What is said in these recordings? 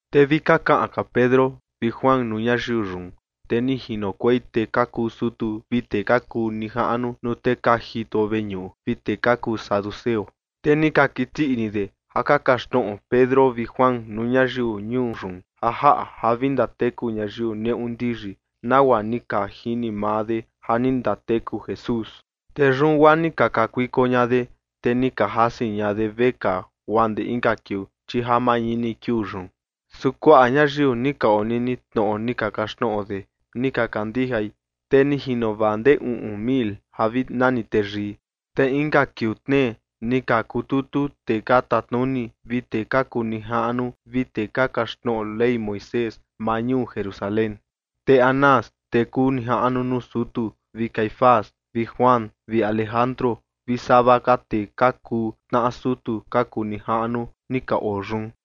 Te vi ka kaꞌan ka Pedro vi Juan nuu ñayiu yun, te ni jinokuei tee ka kuu sutu vi tee ka kuu nijaꞌnu nuu tee ka jito veñuꞌu vi tee ka kuu saduceo. Te ni ka kiti ini de ja ka kaxtnoꞌo Pedro vi Juan nuu ñayiu ñuu yun ja jaꞌa ja vi ndateku ñayiu neꞌu ndiyi, nagua ni ka jini maa de ja ni ndateku Jesús. Te yun guaa ni ka kakuiko ña de, te ni ka jasi ña de vekaa guaa ndee inka kiuu, chi ja mañini kiuu yun. Su kuaꞌa ñayiu ni ka onini tnoꞌo ni ka kaxtnoꞌo de ni ka kandijai, te ni jino vaa ndee uꞌun mil ja vi nani teyii. Te inka kiuu tnee ni ka kututu tee ka tatnuni vi tee ka kuu nijaꞌnu vi tee ka kaxtnoꞌo Ley Moisés maa ñuu Jerusalén. Te Anás, tee kuu nijaꞌnu nuu sutu, vi Caifás vi Juan vi Alejandro vi sava ka tee ka kuu tnaꞌa sutu ka kuu nijaꞌnu ni ka oo yun.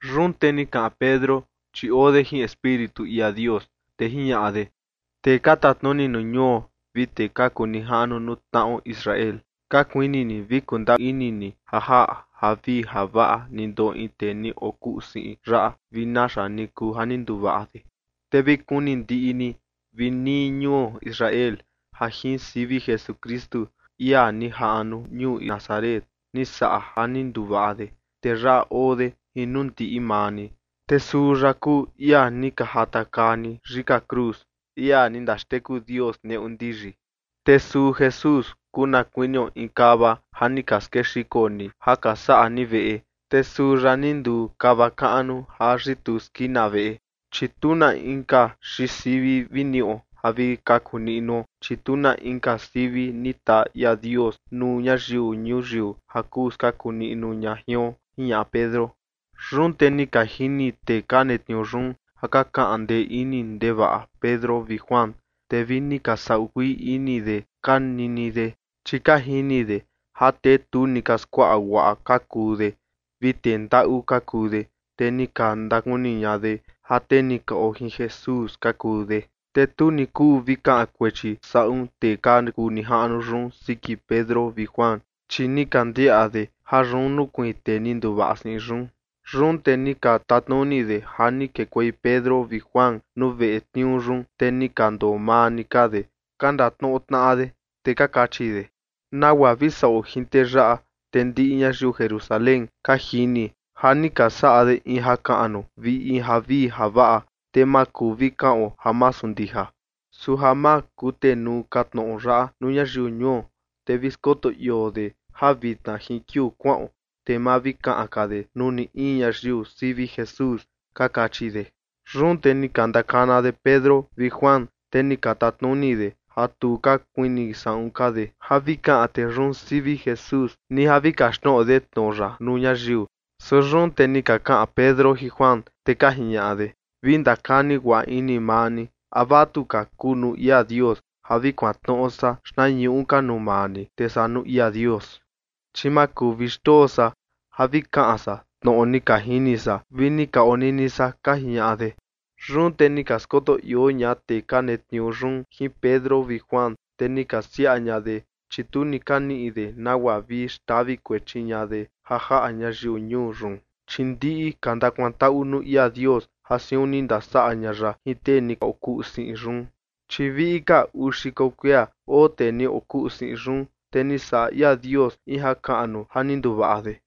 Yun te ni kaꞌan Pedro, chi oo de jin Espíritu ia Dios, te jiñaꞌa de: ―Tee ka tatnuni nuu ñuo vi tee ka kuu nijaꞌnu nuu tnaꞌo Israel, ka kuini ni vi kundaa ini ni ja jaꞌa javii javaꞌa ni ndoꞌo in tee ni okuꞌu siꞌin yaꞌa vi naxa ni kuu ja ni nduvaꞌa de. Te vi kuni ndiꞌi ni vi nii ñuo Israel ja jin sivi Jesukristu, ia ni jaꞌnu ñuu Nazaret, ni saꞌa ja ni nduvaꞌa de, te yaꞌa oo de jin nuu ndiꞌi maa ni, te suu ya kuu ia ni ka jatakaa ni yika cruz, ia ni ndaxteku Dios neꞌu ndiyi. Te suu Jesús kuu na kuinio in kava ja ni ka skexiko ni ja ka saꞌa ni veꞌe, te suu ya ni nduu kava kaꞌnu ja yituu skina veꞌe. Chi tu na inka xiin sivi vi niꞌo ja vi kaku niꞌnuo, chi tu na inka sivi ni taa ia Dios nuu ñayiu ñuyiu ja kuu skaku niꞌnu ña jion ―jiñaꞌa Pedro. Yun te ni ka jini tee ka netniuu yun ja ka kaꞌan ndee ini ndevaꞌa Pedro vi Juan, te vi ni ka saꞌu kuii ini de ka nini de, chi ka jini de ja tee tu ni ka skuaꞌa guaꞌa ka kuu de vi tee ndaꞌu ka kuu de, te ni ka ndakuni ña de ja tee ni ka oo jin Jesús ka kuu de. Te tu ni kuu vi kaꞌan kuechi saꞌun tee ka kuu nijaꞌnu yun siki Pedro vi Juan, chi ni ka ndiaꞌa de ja yun nukuiin tee ni nduvaꞌa siꞌin yun. Yun te ni ka tatnuni de ja ni kekuei Pedro vi Juan nuu veꞌe tniuu yun, te ni ka ndoo maa ni ka de, ka ndatnoꞌo tnaꞌa de. Te ka kachi de: ―¿Nagua vi saꞌo jin tee yaꞌa? Te ndiꞌi ñayiu Jerusalén ka jini ja ni ka saꞌa de in jakaꞌnu vi javii javaꞌa, te ma kuu vi kaꞌon ja masu ndija. Su ja ma kutenuu ka tnoꞌo yaꞌa nuu ñayiu ñuo, te vi skoto ioo de ja vitna jin kiuu kuaꞌon, te ma vi kaꞌan ka de nuu ni in ñayiu sivi Jesús ―ka kachi de. Yun te ni ka ndakana de Pedro vi Juan, te ni ka tatnuni de ja tu ka kuini saꞌun ka de ja vi kaꞌan tee yun sivi Jesús, ni ja vi kaxtnoꞌo de tnoꞌo ya nuu ñayiu. Su yun te ni ka kaꞌan Pedro jin Juan, te ka jiñaꞌa de: ―Vi ndakani guaꞌa ini maa ni, ¿a vatuka kuu nuu ia Dios ja vi kuantnoꞌo san xtnañuꞌu ka nuu maa ni, te saa nuu ia Dios? Chi ma kuu vi xndoo san ja vi kaꞌan san tnoꞌo ni ka jini san vi ni ka onini san ―ka jiñaꞌa de. Yun te ni ka skoto ioo ña tee ka netniuu yun jin Pedro vi Juan, te ni ka siaa ña de, chi tu ni ka niꞌi de nagua vi xtavi kuechi ña de ja jaꞌa ñayiu ñuu yun, chi ndiꞌi ka ndakuantaꞌu nuu ia Dios ja siun ni ndasaꞌa ña ya jin tee ni okuꞌu siꞌin yun. Chi viꞌi ka uu xiko kuia oo tee ni okuꞌu siꞌin yun, te ni saꞌa ia Dios in jakaꞌnu ja ni nduvaꞌa de.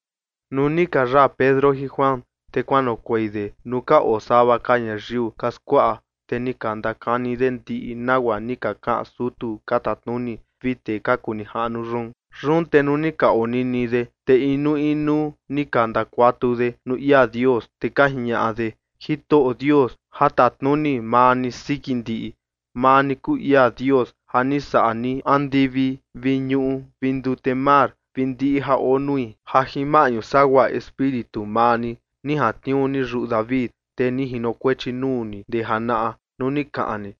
Nuu ni ka yaa Pedro jin Juan, te kuanoꞌokuei de nuu ka oo sava ka ñayiu ka skuaꞌa, te ni ka ndakani de ndiꞌi nagua ni ka kaꞌan sutu ka tatnuni vi tee ka kuu nijaꞌnu yun. Yun te nuu ni ka onini de, te inuu inuu ni ka ndakuatu de nuu ia Dios, te ka jiñaꞌa de: ―Jitoꞌo Dios, ja tatnuni maa ni siki ndiꞌi, maa ni kuu ia Dios ja ni saꞌa ni andivi vi ñuꞌu vi ndute mar vi ndiꞌi ja oo nui, ja jin maꞌñu sagua Espíritu maa ni, ni jantniuu ni yuꞌu David, tee ni jinokuechi nuu ni ndee janaꞌa nuu ni kaꞌan ni: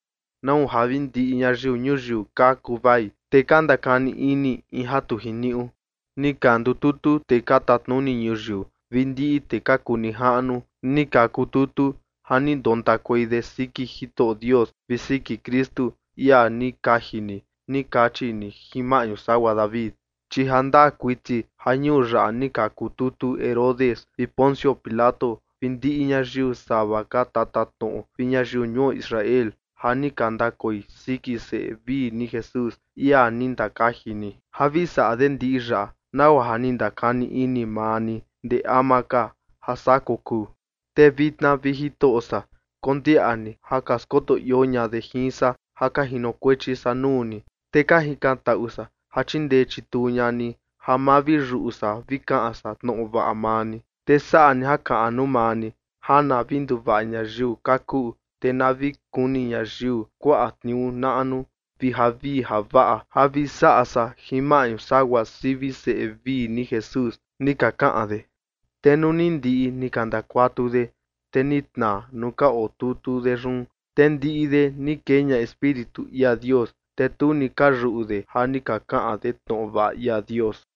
¿Nau ja vi ndiꞌi ñayiu ñuyiu ka kuvai, te ka ndakani ini, in ja tu jiniuꞌu? Ni ka ndututu tee ka tatnuni ñuyiu vi ndiꞌi tee ka kuu nijaꞌnu ni ka kututu, ja ni ndontakuei de siki Jitoꞌo Dios vi siki Kristu, ia ni kaji ni ni kachi ni jin maꞌñu sagua David. ’Chi ja ndaa kuiti ja ñuu yaꞌa ni ka kututu Herodes vi Poncio Pilato vi ndiꞌi ñayiu sava ka tatatnoꞌo vi ñayiu ñuo Israel ja ni ka ndakoi siki seꞌe vii ni Jesús, ia ni ndakaji ni, ja vi saꞌa de ndiꞌi yaꞌa, nagua ja ni ndakani ini maa ni ndee ama ka ja saa kokuu. Te vitna, vi Jitoꞌo san, kondiaꞌa ni ja ka skoto ioo ña de jin san ja ka jinokuechi san nuu ni, te ka jikantaꞌu san ja chindee chituu ña ni ja ma vi yuꞌu san vi kaꞌan san tnoꞌo vaꞌa ni. Te saꞌa ni jakaꞌnu maa ni ja na vi nduvaꞌa ñayiu ka kuꞌu, te na vi kuni ñayiu kuaꞌa tniuu naꞌnu vi javii javaꞌa ja vi saꞌa san jin maꞌñu sagua sivi seꞌe vii ni Jesús ―ni ka kaꞌan de. Te nuu ni ndiꞌi ni ka ndakuatu de, te ni tnaa nuu ka otutu de yun. Te ndiꞌi de ni kee ña Espíritu ia Dios, te tu ni ka yuꞌu de ja ni ka kaꞌan de tnoꞌo vaꞌa ia Dios.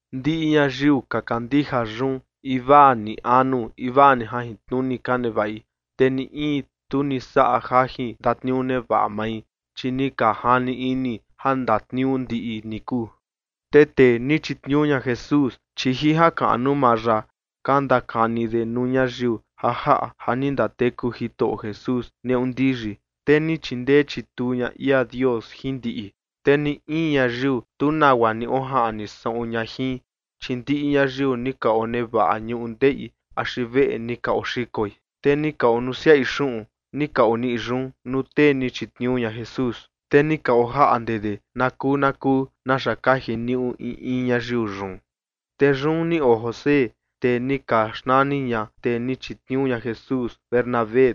Ndiꞌi ñayiu ka kandija yun, invaa ni anu invaa ni jajintnuni ka nevaꞌi. Te ni in tu ni saꞌa jajin ndatniuu nevaꞌa mai, chi ni ka jani ini ja ndatniuu ndiꞌi ni kuu. Te tee ni chitniuu ña Jesús, chi jin jakaꞌnu maa ya ka ndakani de nuu ñayiu ja jaꞌa ja ni ndateku Jitoꞌo Jesús neꞌu ndiyi. Te ni chindee chituu ña ia Dios jin ndiꞌi. Te ni in ñayiu, tu nagua ni ojaꞌni saꞌun ña jin. Chi ndiꞌi ñayiu ni ka onevaꞌa ñundeꞌi axi veꞌe ni ka oxikoi, te ni ka onusiaꞌi xuꞌun ni ka oniꞌi yun nuu tee ni chitniuu ña Jesús. Te ni ka ojaꞌnde de na kuu na kuu naxa ka jiniuꞌu in in ñayiu yun. Te yun ni oo José, tee ni ka xnani ña tee ni chitniuu ña Jesús, Bernabé,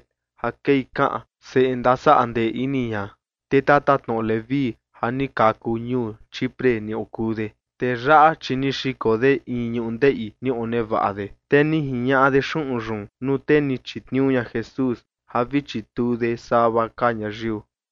ja kei kaꞌan seꞌe ndasaꞌa ndee ini ña, tee tatatnoꞌo Leví ja ni kaku ñuu Chipre ni okuu de. Tee yaꞌa, chi ni xiko de in ñundeꞌi ni onevaꞌa de, te ni jiñaꞌa de xuꞌun yun nuu tee ni chitniuu ña Jesús ja vi chituu de sava ka ñayiu.